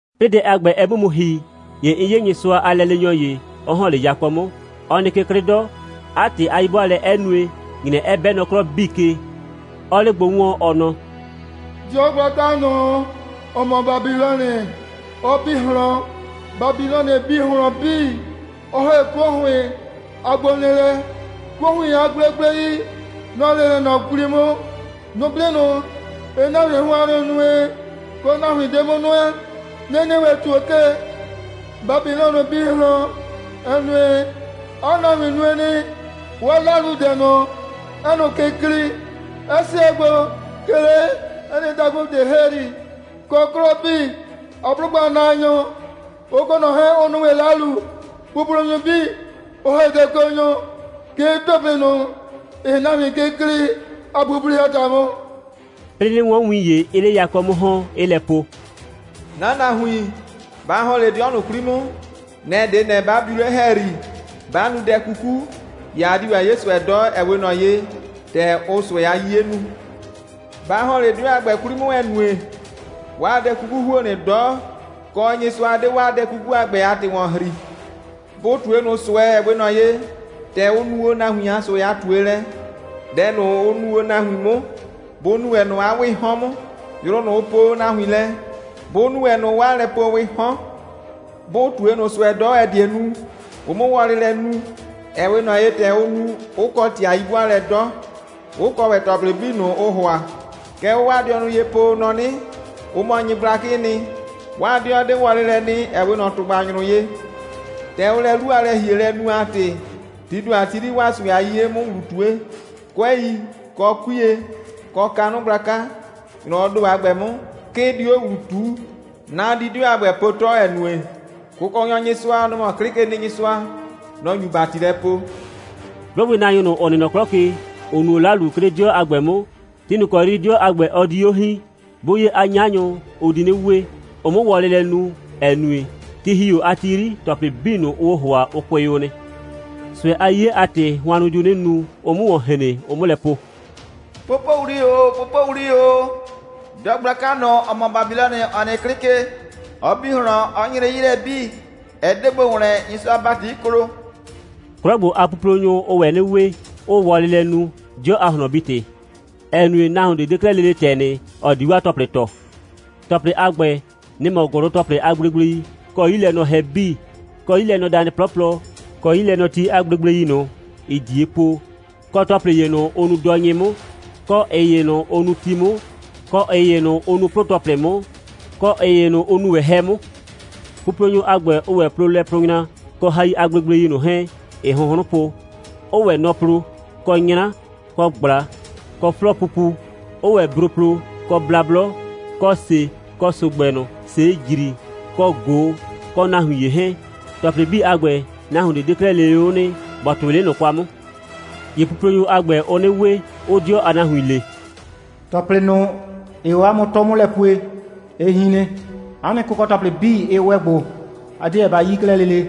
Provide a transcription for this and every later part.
'Plɩɩ dɛ a ‑gbɛ, ɛ 'mʋ mu ‑hi, ‑ye 'n 'ye Nyɩsʋa a lɛleenyɔ ‑ye, 'ɔ ‑hɔn 'le yakɔ 'mʋ. Ɔ nɩ ke 'klɩ 'dɔ, 'a ‑tɩ a 'yi'bʋaalɛ 'ɛ nue, ‑nyrɛ 'ɛ 'bɛ nɔ 'klɔ 'bii ke, 'ɔɔ 'le gbo 'wɔɔn, ɔ nɔ: «'Dɩɔ gblaka ꞊nʋ, ‑ɔ mɔ Babilɔnɩ, ɔ bi ꞊hlɔn. Babilɔnɩ bi ꞊hlɔn 'bii, 'ɔ ‑hɛ 'kuo ‑hʋɩn a gbonɩɩlɛ. 'Kuo ‑hʋɩn a gblegblei, nɔ‑ nɩ 'le ꞊nɔ 'kwli 'mʋ. Nʋblɩ ꞊nʋ, ‑ɩɩ nahuin hʋannʋ nue, kɔ nahuin 'de 'mʋ nʋɛ, nɩ‑ nɩ ‑wɛ ‑tuo ke. Babilɔnɩ bi ꞊hlɔn, ‑ɛ nue, 'a nahuin nue nɩ, 'waa 'laludɛ ꞊nʋ, ‑ɛɛ ꞊nʋ ke klɩɩ, 'ɛ 'sɛɛ gbo, 'ke 'le 'ɛ nɩ dakʋ ꞊de ‑hɛyri, kɔ, 'klɔ 'bii a 'blʋgbɩnaanyʋ, ʋ kɔ ꞊nʋ 'hɛɛn 'ʋ nu ‑wɛ 'lalu, puplonyʋ 'bii, 'ʋ ‑hɛ dɛkɔnyʋ, 'ke 'o ‑tɔplɩ ꞊nʋ, ‑ɩɩ nahuin ke klɩɩ a puple a ‑ta 'mʋ.» 'Plɩɩ 'nɩ 'wɔn win ‑ye, 'ɩɩ 'le yakɔ 'mʋ ‑hɔn, 'ɩɩ lɛ po: «'Na nahuin, ba ‑hɔn 'le 'dɩɔ ꞊nʋ 'kwli 'mʋ. Nɛ‑ 'de ꞊nɛ, 'ba biu 'le ‑hɛyri, 'ba nu dɛ 'kuku, ‑ye a di ‑wɛ 'ye ꞊sʋɛ 'dɔ, ‑ɛ 'we ꞊nɔ ye, ‑tɛ ʋʋ ꞊sʋɛ a 'yiye nu. Ba ‑hɔn 'le 'dɩɔ a ‑gbɛ 'kwli 'mʋ, ‑ɛ nue, 'waa dɛ 'kuku ‑huo nɩ 'dɔ, kɔ, Nyɩsʋa 'de 'waa dɛ 'kuku a ‑gbɛ a ‑tɩ ‑wɔn ‑hri. Bʋ ꞊tue ꞊nʋ ꞊sʋɛ, ‑ɛ 'we ꞊nɔ ye, ‑tɛ ʋ nu o nahuin a ꞊sʋɛ a ꞊tuelɛ. Dɛ ꞊nʋ, ʋ nu o nahuin 'mʋ, bʋ nu ‑wɛ ꞊nʋ 'a 'wɩɩ 'hɔn 'mʋ. Yrʋ ꞊nʋ, ʋ poo o nahuin lɛ, bʋ nu ‑wɛ ꞊nʋ 'waa lɛpoowɩɩ 'hɔn. Bʋ ꞊tue ꞊nʋ ꞊sʋɛ 'dɔ, ‑ɛ die nu, ʋ 'mʋ wɔlɩ lɛ nu, ‑ɛ 'we ꞊nɔ ye, ‑tɛ ʋ nu, 'ʋ kɔ ‑tɩ a 'yi'bʋaalɛ 'dɔ, 'ʋ kɔ ‑wɛ ‑tɔplɩ 'bii ꞊nʋ, ʋʋ ‑hʋa. Kɛ ʋʋ 'waa dɩɔnʋ ye po, ʋ nɔ 'nɩ, ʋ mɔ nyɩgblakɩɩ nɩ, 'waa 'dɩɔ 'de wɔlɩ lɛ nɩ, ‑ɛ 'we ꞊nɔ ‑tʋgbanyrʋ ye. ‑Tɛ ʋʋ lɛ 'lu a lɛ‑hielɛ nu a ‑tɩ, tii ‑do a ti 'yri, 'waa ꞊sʋɛ a 'yiye 'mʋ ‑wlu ꞊tue. 'Kʋɛi, kɔ 'kuiye, kɔ kanʋ gblaka, ‑nyrɔwɔɔ ‑do a ‑gbɛ 'mʋ, 'ke ɩ di ‑wɛ 'o ‑wlu ꞊tuu. Na di 'dɩɔ a ‑gbɛ po 'tɔ, ‑ɛ nue, Kʋkɔnyɔ Nyɩsʋa, nɔ‑ mɔ 'Klɩkenɩnyɩsʋa, nɔ‑ nyu ‑bati lɛ poo.» 'Blʋgbɩnaanyʋ, ‑ʋ nɩ nɔ 'klɔ ke, ‑ʋ nu o 'lalu, 'ke 'le 'dɩɔ a ‑gbɛ 'mʋ, ti ꞊nʋ ‑kɔ 'yri 'dɩɔ a ‑gbɛ, ɔ di 'o hiin, 'bʋ 'ye 'a 'nyanyʋ, ʋ di 'nɩ we, ʋ 'mʋ wɔlɩ lɛ nu, ‑ɛ nue, ti ‑hi o a ti 'yri, ‑tɔplɩ 'bii ꞊nʋ, ʋʋ o ‑hʋa, ʋ kʋɩ o nɩ. ꞊Sʋɛ a 'yiye a ‑tɩ, hʋannʋ diu 'nɩ nu, ʋ 'mʋ ‑wɔn hren, ʋ 'mʋ lɛ po: «Popowli ‑o, popowli ‑o. 'Dɩɔ gblaka ꞊nʋ, ‑ɔ mɔ Babilɔnɩ, ‑ɔ nɩ o 'klɩ ke, ɔ bi ꞊hlɔn, 'ɔ nyre 'yi lɛ 'bii. Ɛ 'de gbo ‑wlɛn, Nyɩsʋa a ‑bati 'ɩ klo.» 'Klɔ ‑gbo a puplonyʋ, ʋʋ ‑wɛ 'nɩ we, 'ʋʋ wɔlɩ lɛ nu, 'dɩɔ a ꞊hlɔnbi‑tɩ, ‑ɛ nue, nahuon ꞊de 'de 'klɛɛ lele ‑tɛ nɩ, ‑ɔ di 'waa ‑tɔplɩ ‑tɔ. ‑Tɔplɩ a ‑gbɛ, nɩ‑ mɔ: ‑gʋlʋ‑tɔplɩ a gblegblei, kɔ 'yilɛnɔhɛ 'bii, kɔ 'yilɛnɔdanɩ 'plɔplɔ, kɔ 'yilɛnɔti a gblegblei ꞊nʋ, ‑ɩɩ ꞊die po, kɔ ‑tɔplɩ ‑ye ꞊nʋ, ʋ nuu dɔnyɩ 'mʋ, kɔ ꞊ɩ ‑ye ꞊nʋ, ʋ nuu ti 'mʋ, kɔ ꞊ɩ ‑ye ꞊nʋ, ʋ nuu 'plʋ‑tɔplɩ 'mʋ, kɔ ꞊ɩ ‑ye ꞊nʋ, ʋ nuu ‑wɛ 'hɛ 'mʋ. Puplonyʋ a ‑gbɛ, ʋʋ ‑wɛ plo lɛplʋʋnyra kɔ hai a gblegblei ꞊nʋ 'hɛɛn, ‑ɩɩ hʋnhrʋn po, 'ʋʋ ‑wɛ nɔ plo, kɔ 'nyra, kɔ ꞊gbla, kɔ 'flɔɔpupu, 'ʋʋ ‑wɛ bro plo, kɔ blablɔ, kɔ ‑se, kɔ ‑so‑gbɛ ꞊nʋ, ‑see ‑jri, kɔ ꞊go, kɔ nahuin ‑ye 'hɛɛn. ‑Tɔplɩ 'bii a ‑gbɛ, nahuon ꞊de 'de 'klɛɛ lele 'o nɩ, ‑bɔ ‑tʋɩ 'le ꞊nʋ kwa 'mʋ. ‑Ye puplonyʋ a ‑gbɛ, ʋʋ 'nɩ we, 'ʋʋ 'dɩɔ a nahuin le: «‑Tɔplɩ ꞊nʋ, ‑ɩɩ o 'a mʋ 'tʋ 'mʋ lɛ pue, ɩ hin nɩ. 'A nɩ kʋkɔ‑tɔplɩ 'bii, ɩ ‑wɛ gbo. A 'deɛ ba 'yi 'klɛɛ lele.»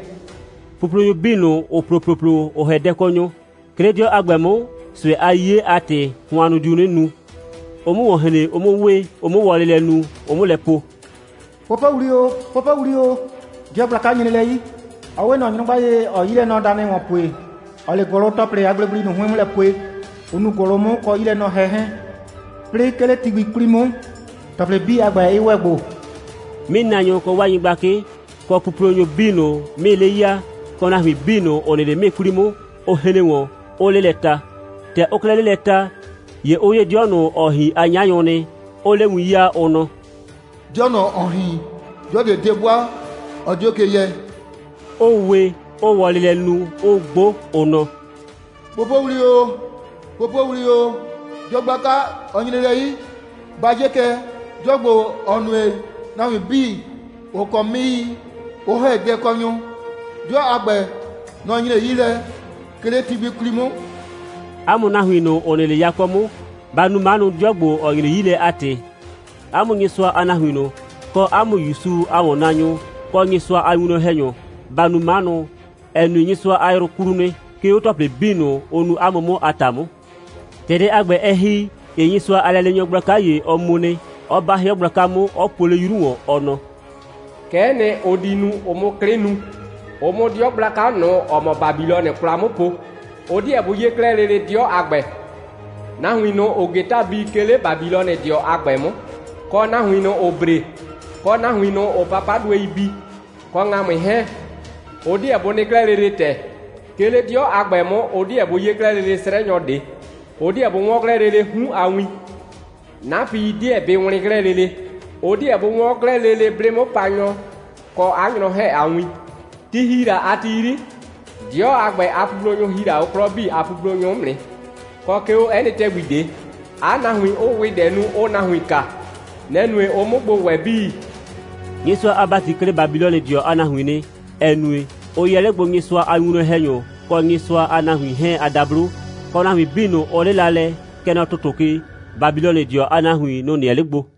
Puplonyʋ 'bii ꞊nʋ, ‑ʋ plo ‑ploplo, ‑ʋ ‑hɛ dɛkɔnyʋ, 'ke 'le 'dɩɔ a ‑gbɛ 'mʋ, ꞊sʋɛ a 'yiye a ‑tɩ, hʋannʋ diu 'nɩ nu, ʋ 'mʋ ‑wɔn hren, ʋ 'mʋ we, ʋ 'mʋ wɔlɩ lɛ nu, ʋ 'mʋ lɛ po: «Popowli ‑o, popowli ‑o. 'Dɩɔ gblaka nyre lɛ 'yi. Ɔ 'we ꞊nɔ nyrʋgba ye, ‑ɔɔ 'yilɛnɔdanɩ ‑wɔn pue, ‑ɔɔ 'le ‑gʋlʋ‑tɔplɩ a gblegblei ꞊nʋ 'hʋɩn 'mʋ lɛ pue, ʋ nuu ‑gʋlʋ 'mʋ kɔ 'yilɛnɔhɛ 'hɛɛn. 'Plɩɩ, 'ke 'le ti gbi 'kwli 'mʋ, ‑tɔplɩ 'bii a ‑gbɛ, 'ɩ ‑wɛ gbo.» 'Mɩɩnaanyʋ kɔ 'waa nyɩgblakɩ, kɔ puplonyʋ 'bii ꞊nʋ, 'mɩɩii 'le ya, kɔ nahuin 'bii ꞊nʋ, ‑ʋ nɩ 'le 'mɩɩi 'kwli 'mʋ, ʋ hren ‑wɔn, 'ʋʋ 'le lɛ ta. ‑Tɛ ʋʋ 'klɛɛ 'le lɛ ta, ‑ye ʋ 'ye 'dɩɔ ꞊nʋ, ‑ɔɔ hin a 'nyanyʋ nɩ, 'ʋʋ 'le win 'yaa, ʋ nɔ: «'Dɩɔ ꞊nʋ, ‑ɔɔ hin, 'dɩɔ ꞊de 'de 'bʋa, ɔ 'dio ke yɛ,» 'ʋʋ we, 'ʋʋ wɔlɩ lɛ nu, 'ʋʋ 'gbo, ʋ nɔ: «Popowli ‑o, popowli ‑o. 'Dɩɔ gblaka, ɔ nyre lɛ 'yi. Ba 'ye kɛ, 'dɩɔ ‑gbo, ‑ɔ nue, nahuin 'bii, ‑ʋ kɔ 'mɩɩi, 'ʋ ‑hɛ dɛkɔnyʋ, 'dɩɔ a ‑gbɛ, nɔ‑ nyre 'yi lɛ, 'ke 'le ti gbi 'kwli 'mʋ.» 'A mʋ nahuin ꞊nʋ, ‑ʋ nɩ 'le yakɔ 'mʋ, ba nu 'manʋ, 'dɩɔ ‑gbo, ‑ɔ nyre 'yi lɛ a ‑tɩ. 'A mʋ Nyɩsʋa a nahuin ꞊nʋ, kɔ 'a mʋ ‑Yusu a ‑wɔnnaanyʋ, kɔ Nyɩsʋa a winwlɔn‑hɛnyʋ, ba nu 'manʋ, ‑ɛ nue, Nyɩsʋa a yrʋ klu nɩ, 'ke 'o ‑tɔplɩ 'bii ꞊nʋ, ʋ nu 'a mʋ 'mʋ a ‑ta 'mʋ. ‑Tɛ dɛ a ‑gbɛ, ɛ ‑hi, ‑ye Nyɩsʋa a lɛleenyɔ gblaka ‑ye, ɔ mu nɩ, 'ɔ 'ba 'hɩɔ gblaka 'mʋ, 'ɔ puo 'le 'yru ‑wɔn, ɔ nɔ: «Kɛ'ɛ nɩ, ʋ di nu, ʋ 'mʋ 'klɩ nu, ʋ 'mʋ 'dɩɔ gblaka ꞊nʋ, ‑ɔ mɔ Babilɔnɩ 'kwla 'mʋ po. Ʋ 'deɛ bʋ 'ye 'klɛɛ lele 'dɩɔ a ‑gbɛ. Nahuin ꞊nʋ, ‑ʋʋ ‑geta bi, 'ke 'le Babilɔnɩdɩɔ a ‑gbɛ 'mʋ, kɔ nahuin ꞊nʋ, ‑ʋʋ bre, kɔ nahuin ꞊nʋ, ‑ʋʋ papaduei bi, kɔ ‑ŋamʋɩ 'hɛɛn, ʋ 'deɛ bʋ nɩ 'klɛɛ lele ‑tɛ. 'Ke 'le 'dɩɔ a ‑gbɛ 'mʋ, ʋ 'deɛ bʋ 'ye 'klɛɛ lele 'srɛnyɔ ꞊de, ʋ 'deɛ bʋ 'wɔn 'klɛɛ lele 'hun a win. 'Napɩi 'deɛ bɩ wlɩn 'klɛɛ lele. Ʋ 'deɛ bʋ 'wɔn 'klɛɛ lele 'blɩ'mʋpanyɔ kɔ 'a nyrɔ 'hɛɛn a win. Ti ‑hi la a ti 'yri, 'dɩɔ a ‑gbɛ a puplonyʋ ‑hi la 'o 'klɔ 'bii a puplonyʋ 'mʋ nɩ, kɔ, 'ke 'o 'ɛ nɩ ‑tɛgbi ꞊de, 'a nahuin 'ʋʋ ‑wɩdɛ nu, 'ʋʋ nahuin kaa. Nɛ‑ nue, ʋ 'mʋ gbo ‑wɛ 'bii.» Nyɩsʋa a ‑bati klɩ Babilɔnɩdɩɔ a nahuin nɩ, ‑ɛ nue, ʋ yɛ 'le gbo Nyɩsʋa a winwlɔn‑hɛnyʋ kɔ Nyɩsʋa a nahuin 'hɛɛn a dablo; kɔ, nahuin 'bii ꞊nʋ, ʋ 'lɩla lɛ, kɛ nɔ ‑tʋtʋ ke, Babilɔnɩdɩɔ a nahuin, nʋ‑ nɩɛ 'le gbo.